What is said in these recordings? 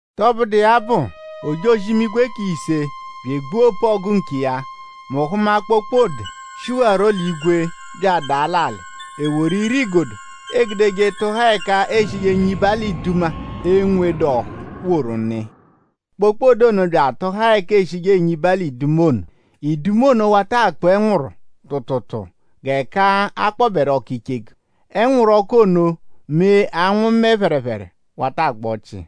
Tọbudu iya bụ; ojozi-imigwe k'ise bya egbua opu-ọgu nkiya. Mu hụma kpokpode, shihawarọ l'igwe bya adaa l'alị. E woru ire-igodo, eegudeje tụhaa ẹka eeshije enyiba l'iduma, enwedu ọ́hú woru nụ iya. Kpokpode ono bya atụhaa ẹka eeshije enyiba l'iduma ono. Iduma ono wata akpụ ẹnwuru tụutuutuu g'ẹka a kpọberu ọku icheku. Ẹnwuru ọku ono mee anwụ mẹ phẹrephere wata agba ọchii.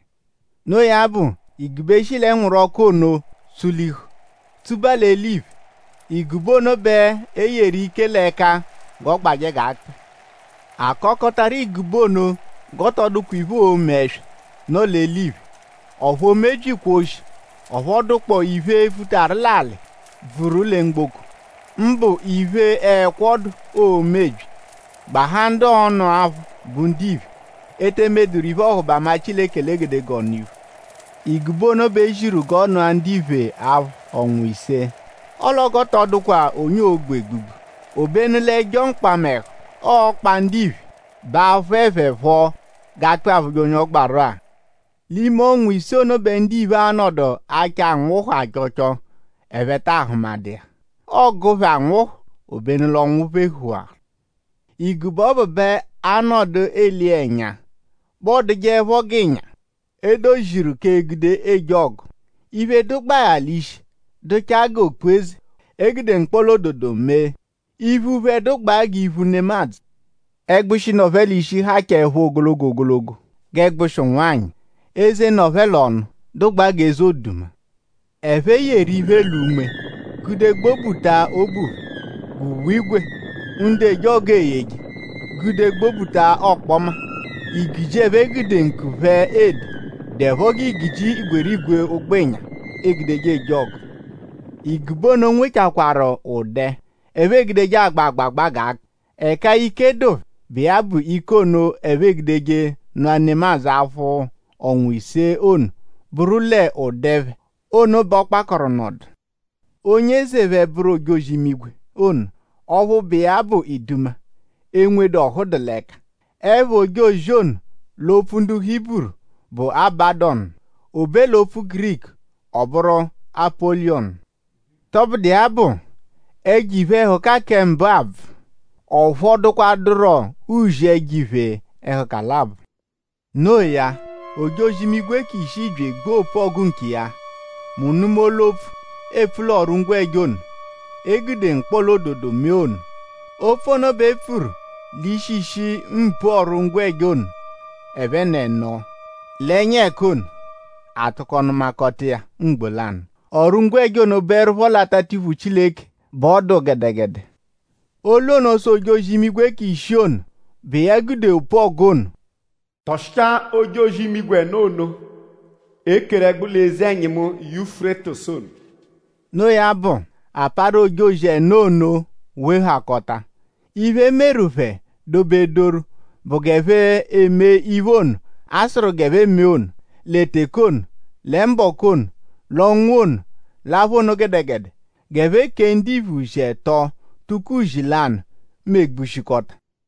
Noo ya bụ; igube shi l'ẹnwuru-ọku ono tsulihu tsuba l'eliphe. Igube ono bẹ e yeru ike l'ẹka g'ọ gbajẹ g'akpị. A kakọtaru igube ono g'ọ tọ dụkwa iphe, oo-me ẹswa, nọ l'eliphe; ọphu o mebyikwa oshi; ọphu ọ dụkpoo iphe, futaru l'alị bvuru lẹ mgboko; mbụ iphe ẹkwo dụ, oo-mebyi; gbahaa ndu ọonu aphụ bụ ndiphe, e te emeduru iphe-ọhubama Chileke l'egedegee ọnu-iphu. Igube ono bẹ e ziru g'ọ nụa ndiphe aphụ ọnwa ise; ọle ọ g'ọ tọ dụkwa onye oo-gbu egbugbu. Obenu l'ẹjo mkpamẹhu, ọo-kpa ndiphe bẹ a-phụe phẹ phọ g'akpị aphụje onye ọ gbaru-a. L'ime ọnwa ise ono bẹ ndiphe a-nọdu achọ anwụhu achọcho; ẹphe taa hụmadu iya. Ọo-gụ phẹ anwụhu; obenu l'ọnwu phehuwaru. Igube ọbu bẹ a -nọdu ele iya ẹnya bẹ ọodugbajeepho g'ịnya, e doziru k'egude eje ọgu. Iphe, dụgbaa ya l'ishi dụchaa g'okpu-eze, e gude mkpọla-ododo mee. Iphu phẹ dụgbaa g'iphu nemadzụ. Ẹgbushi, nọ phẹ l'ishi hachaẹpho ogologo ogologo g'ẹgbushi ụnwanyi. Eze, nọ phẹ l'ọnu dụgbaa g'eze oduma. Ẹphe yeru iphe l'unme gude gbobuta obu phẹ g'uwe-ígwè, ndu eje ọgu eyeje gude gbobuta ọkpoma. Igiji, ẹphe gude ǹkù phẹ ede dụepho g'igiji igwerigwe ụgbo-ịnya, e gude eje ọgu. Igube ono nwechakwaaru ụ̀dé, ẹphe egudeje agba agbagba g'akpị. Ẹka ike dụ phẹ, bụ iya bụ ike ono, ẹphe e-gude nụa nemadzụ aphụ ọnwa ise ono bụru l'ụ̀dé phẹ ono bẹ ọ kpakọru nọdu. Onye eze phẹ bụru ojozi-imigwe ono; ọphu bụ iya bẹ iduma, enwedu ọhu dụ l'ẹka. Ẹpha ojozi ono l'opfu ndu Hiburu bụ Abadọnu; o be l'opfu Giriku; ọ bụru Apọliyonu. Tọbudu iya bụ; ẹjo iphe-ẹhuka kẹ mbụ abvụ. Ọ phọdukwaduro uzi ẹjo iphe-ẹhuka labọ. No iya; ojozi-imigwe k'ishii bya egbua opu-ọgu nkiya; mu nụma olu-opfu, eepfu l'ọru-ngwẹja ono, e gude mkpọla-ododo mee ono. Opfu ono bẹ e pfuru l'ishishi mpu ọru-ngwẹja ono ẹphen'ẹno l'ẹnya ẹka ono; a tụko nụmakota iya mgbo lanụ. Ọru-ngwẹja ono bụerupho l'atatiphu Chileke bẹ ọ dụ gẹdegede. Olu ono sụ ojozi-imigwe k'ishii ono, bụ iya gude opu-ọgu ono: “Tọshichaa ojozi-imigwe ẹno ono, e keru ẹgbu l'eze-ẹnyimu Yufurétisu ono.” No iya bụ; a parụ ojozi ẹno ono wehakọta. Iphe, e meru phẹ dobedoru bụ g'ẹphe emee iphe ono, a sụru g'ẹphe mee ono; lẹ teke ono; lẹ mbọku ono; l'ọnwa ono; l'apha ono gẹdegede. G'ẹphe kèé ndiphe uzi ẹto; tụko uzi lanụ megbushikọta.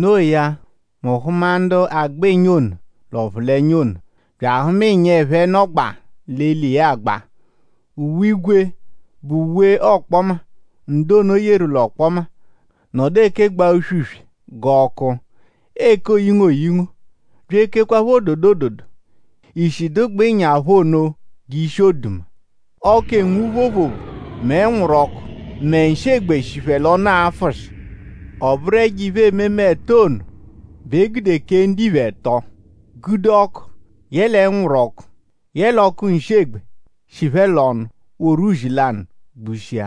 No iya; mu hụma ndu agba ịnya ono l'ọphulenya ono; bya ahụma ịnya, ẹphe nọgbaa l'eli iya agba. Uwe-ígwè, bụ uwe ọkpoma, ndu ono yeru l'ọkpoma nọdu ekegbaa uswe-uswe g'ọku; eke oyingo oyingo; bya ekekwaphọ ododo ododo. Ishi dụgbaa ịnya phẹ ono g'ishi oduma. Ọku, enwu phoophoophoo; mẹ ẹnwuru-ọku; mẹ nshị-egbe shi phẹ l'ọnu afụshi. Ọ bụru ẹjo iphe-ememe ẹto ono bẹ e gude kèé ndiphe ẹto; gude ọku; yẹle ẹnwuru-ọku; yẹle ọku-nshi-egbe, shi phẹ l'ọnu woru uzi lanụ gbushia.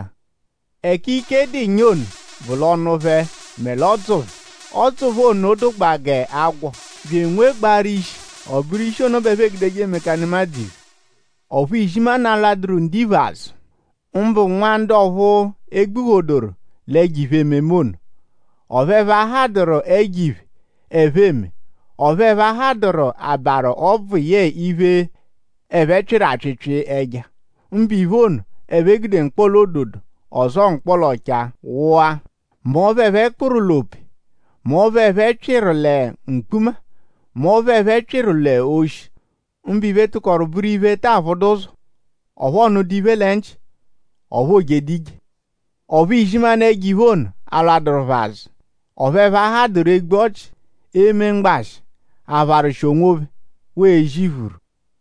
Ẹka ike dụ ịnya ono bụ l'ọnu phẹ mẹ l'ọdzu phẹ. Ọdzu phẹ ono dụgbaa g'agwọ bya enwegbaaru ishi. Ọ bụru ishi ono bẹ ẹphe egudeje emeka nemadzụ iphe. Ọphu izimanụ alwadụru ndiphe azụ; mbụ nwa ndu ọphu e gbuphodoru l'ẹjo iphe-ememe ono. Ọphu ẹphe a hadụru ẹjo-iphe, ẹphe eme; ọphu ẹphe ahadụru abarụ ọbvu yẹe iphe, ẹphe pyịru apyịpyi ẹja; mbụ iphe ono, ẹphe gude mkpọla-ododo ọzoo mkpọla-ọchaa wụa; mẹ ọphu ẹphe kpụru l'ope; mẹ ọphu ẹphe pyịtaru lẹ mkpuma; mẹ ọphu ẹphe pyịru l'oshi. Mbụ iphe tụkoru bụru iphe, ta aphụdu ụzo; ọphu ọ nụdu iphe lẹ nchị; ọphu o jedu ije. Ọphu izimanụ ẹjo-iphe ono alwadụru phẹ azụ; ọphu ẹphe ahadụru egbu ọchi; eme mgbashị; apharwụshi onwophẹ; waa ezi iphuru.